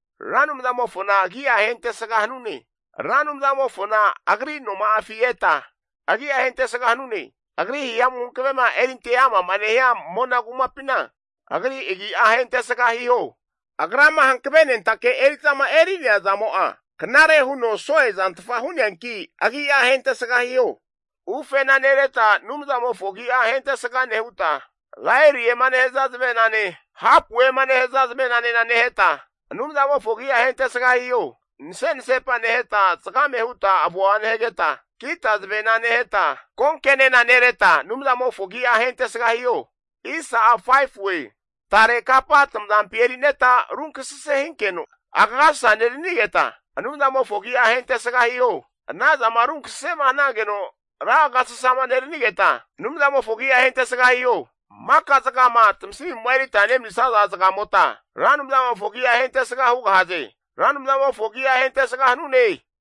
Ra Anumzamofona agi'a ahentesga hanune. Ra Anumzamofona Agri noma'afi eta, agi'a ahentesga hanune. Agri hihamu hankavema erinte ama'ma nehia mona kumapina, Agri agi'a ahentesga hiho. Agrama hankavenentake eri'zama eri'nea zamo'a, knare huno so'e zantfa hu'neanki' agi'a ahentesga hiho. Ufena nereta Anumzamofo agi'a ahentesga nehuta, laeriema nehaza zavenane hapuema nehaza zavenane neheta, Anumzamofo agi'a ahentesga hiho. Nase'nasepa neheta zagame huta avoa nehageta, kita zavena neheta konkenenareta Anumzamofo agi'a ahentesga hiho. Tare kapa tamazampi eri'neta runkasase hinkeno, agasasa neranigeta Anumzamofo agi'a ahentesga hiho. Anazana runkasase'ma hanageno ra agasasama neranigeta, Anumzamofo agi'a ahentesga hiho. Maka zagama tamasimu'ma erita nemanisaza zagamota, Ra Anumzamofo agi'a ahentesga hugahaze. Ra Anumzamofo agi'a ahentesga hanune.